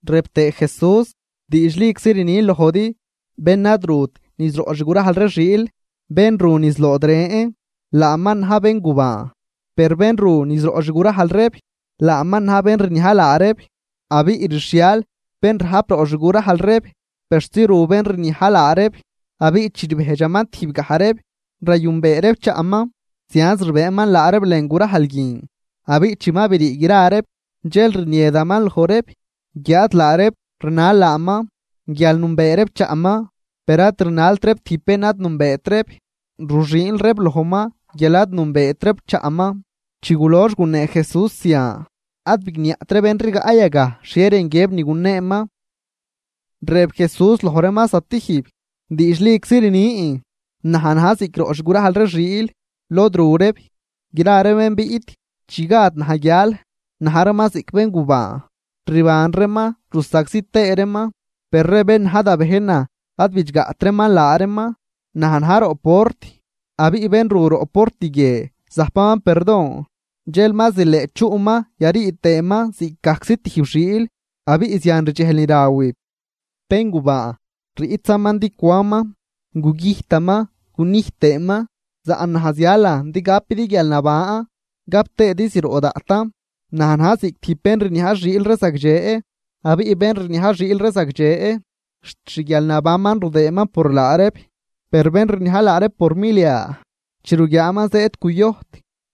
Rëb tëë Jesús: ―Diidxliczi rnin lojdi, bén ad rut niz roꞌ xgurajl ree xiil, bén ru niz lood ren, laaman na̱j béngubaan. Per bén ru niz roꞌ xgurajl reeb, laaman na̱j bén rniaj laa reeb. Abiꞌ rxhial bén rajp roꞌ xgurajl reeb persi ru bén rniaj laa reeb, abiꞌ chi rbejdxaman tijbgaj reeb, rayünbee reeb chaꞌman. Zianz rbëëman laa reeb lën gurajl guin. Abiꞌ chi ma brii gra reeb, dxel rniedaman loj reeb, guiáad laa reeb rnal laaman, guial nünbee reeb chaꞌman. Per ad rnalt reeb tijb bén ad nünbeet reeb, ruxüünl reeb lojman, guial ad nünbeet reeb chaꞌman. Chi gulox gunee Jesús zian, ad bigniaꞌt ree bén rigaꞌ yagaj xhie rën guiëb ni guneeman. Rëb Jesús loj reeman zatijb: ―Diidxliczi rnin, naj na̱j ziꞌc roꞌ xgurajl ree xiil, lod ru reeb. Gra ree bén biꞌt chi gad naj guial na̱j reeman ziꞌc béngubaan, rban reeman rusagzi tëë reeman. Per ree bén na̱j da bejnan ad bidxgaꞌt reeman laa reeman. Naj na̱j roꞌ port, abiꞌ bén ru roꞌ port guie zajpaman perdon, dxel ma zileꞌ chuꞌman yarii tëëman ziꞌcgajczi tijb xiil abiꞌ zian rdxejl ni rawib. ’Béngubaan riꞌtzaman din cwanman, gugüjtaman gunijt tëëman, saꞌn naj zialan din gapidi guialnaban, gap tëëdi zroꞌ daꞌtan. Naj na̱j ziꞌc tijb bén rniaj xiil ree zagdxe. Abiꞌ bén rniaj xiil ree zagdxe xt xguialnabanman rudëëman por laa reeb. Per bén rniaj laa reeb por milia, chi ruguiaaman zëëd cuyojt,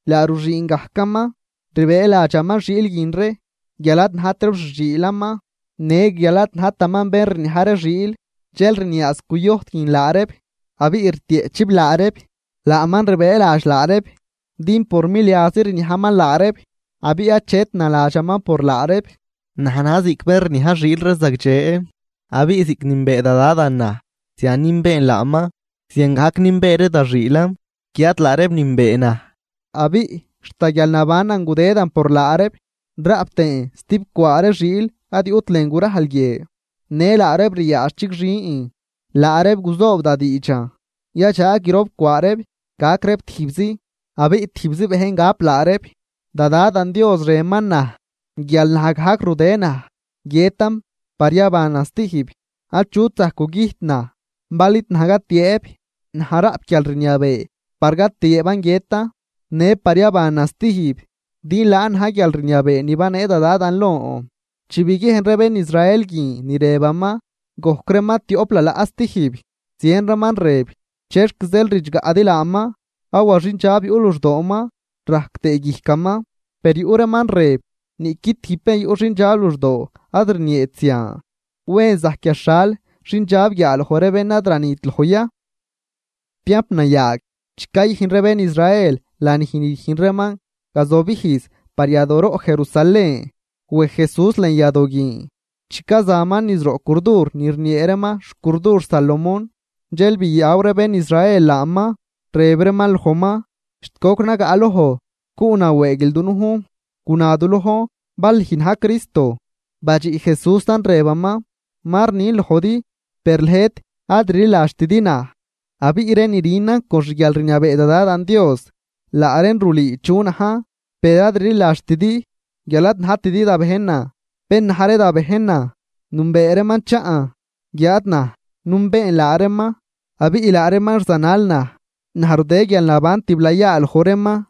laa ruxüün gajcaman, rbëëladxaman xiil guin ree guial ad najt reeb xi xiilaman në guial ad najtaman bén rniaj ree xiil, dxel rniaaz cuyojt guin laa reeb abiꞌ rtieꞌchib laa reeb. Laaman rbëëladx laa reeb, din por miliazi rniajman laa reeb abiꞌ achet naladxaman por laa reeb. ’Naj na̱j ziꞌc bén rniaj xiil ree zagdxe. Abiꞌ ziꞌc nünbee da Dadan naj, zian nünbeen laaman, ziangajc nünbee ree da xiilan, guiáad laa reeb nünbee naj. Abiꞌ xt da guialnabanan gudëdan por laa reeb. Raꞌp tëën stibcwaa ree xiil ad yuꞌt lën gurajl guie. Në laa reeb ryaadx chigxin, laa reeb guzoob da diidxan, yadxaag grop cwaa reeb gac reeb tijbzi, abiꞌ tijbzi bejn gap laa reeb. ’Da Dadan Dios rënman naj guial naj gajc rudë naj guiëtan par yabanan stijb. Achut zajc gugüjt naj bal id naj gatiëëb. Naj raꞌp guialrniabee par gatiëëban guiëtan në par yabanan stijb, din laan na̱j guialrniabee ni banee da Dadan lon. Chi biguiejn ree bén Israel guin ni rëbaman, gojc reeman tioꞌp lalaꞌ stijb. Zien reeman rëb: ―¿Chexc zeel ridxgaꞌdi laaman? Awa xindxab yuꞌ luxdooman rajc tëë guijcaman. Per yuꞌ reeman rëb: ―Niꞌqui tijb bén yuꞌ xindxab luxdoo ad rnieet zian. ¿Wen zajc yaxhal xindxab guiaaloj ree bén ad ranit loj ya? Tiamp nayaag, chi cayüjn ree bén Israel lanij ni rüjn reeman gazobijz par yadooroꞌ Jerusalén. Wej Jesús lën yadoo guin. Chi cazaman niz roꞌ curdur ni rniee reeman xcurdur Salomón. Dxel biyaw ree bén Israel laaman, rëb reeman lojman: ―¿Xt goc nagaꞌloj cuꞌnawëëguil dunujn? Guna du lojn bal lüj na̱j Cristo. Badxiꞌ Jesúsan rëbaman: ―Ma rnin lojdi, per lëjt ad rliladxtidi naj. Abiꞌ ree ni rünan con xguialrniabee da Dadan Dios, laa reen rulüü chu najn. Per ad rliladxtidi, guial ad najtidi da bejnan. Bén na̱j ree da bejnan, nünbee reeman chaꞌn, guiáad naj nünbeen laa reeman, abiꞌ laa reeman rzanal naj. Naj rudë guialnaban tiblayaa loj reeman,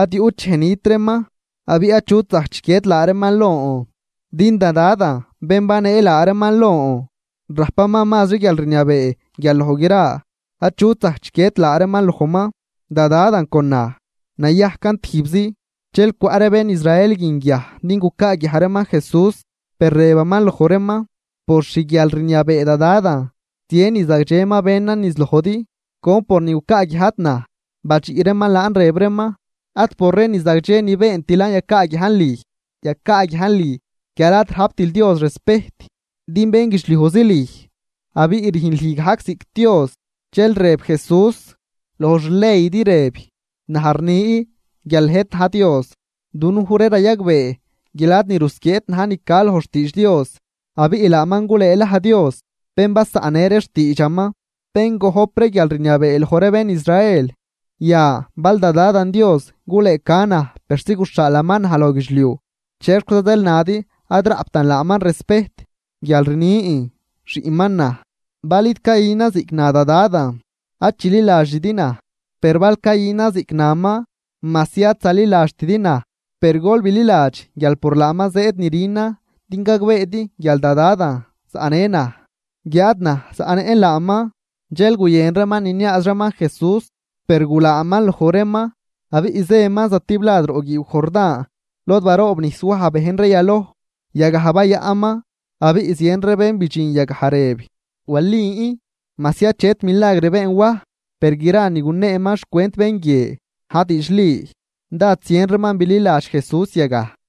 ad yuꞌt dxej nit reeman. Abiꞌ achut zajc chiquied laa reeman lon. Din da Dadan, bén banee laa reeman lon, rajpaman mazri guialrniabee guial loj gra. Achut zajc chiquied laa reeman lojman. Da Dadan con naj, nayajcan tijbzi. Dxel cwaꞌ ree bén Israel guin guiaj din gucaaguiaj reeman Jesús. Per rëbaman loj reeman: ―Por xguialrniabee da Dadan, zien ni zagdxe ma benan niz lojdi. ¿Con pornin gucaaguiajdi naj? Badxiꞌ reeman laan rëb reeman: ―Ad por ree ni zagdxe ni beentilan yacaaguiajn lüj, yacaaguiajn lüj guial ad rajptil Dios respejt, din bénguidxliujzi lüj, abiꞌ rüjn lüj gajc ziꞌc Dios. Dxel rëb Jesús: ―Loj xleydi rëb: “Naj rni guial lëjt na̱j dios.” Dunuj ree rayagbee guial ad ni rusquieet na̱j ni ca loj xtiidx Dios. Abiꞌ laaman gulëëlaj dios bén basaꞌnnë ree xtiidxaman, bén gojp ree guialrniabee loj ree bén Israel. Yan, bal da Dadan Dios gulëëca naj persi guxhaalaman naj loj guidxliuj, ¿chexquiza zeel nadi ad raꞌptan laaman respejt guial rnin, xiꞌnman naj? Bal id cayünan ziꞌc na da Dadan, ad chililadxidi naj. Per bal cayünan ziꞌc naman, majsi ad zaliladxtidi naj, per gol bililadx guial por laaman zëëd ni rünan din gagbeedi guial da Dadan zaꞌnë naj, guiáad naj zaꞌnëꞌn laaman. Dxel guyën reeman niniaaz reeman Jesús, per gulaaman loj reeman. Abiꞌ zëman zatiblad roꞌ guiiw Jordán, lod baroobnijs Waj bejn ree yaloj, yagaj bayaꞌnman. Abiꞌ zien ree bén bidxin yagaj rëb: ―Walin, majsi achet milagr been Waj, per gra ni guneeman xcwent bén guie na̱j diidxli. Dád zien reeman bililadx Jesús yagaj.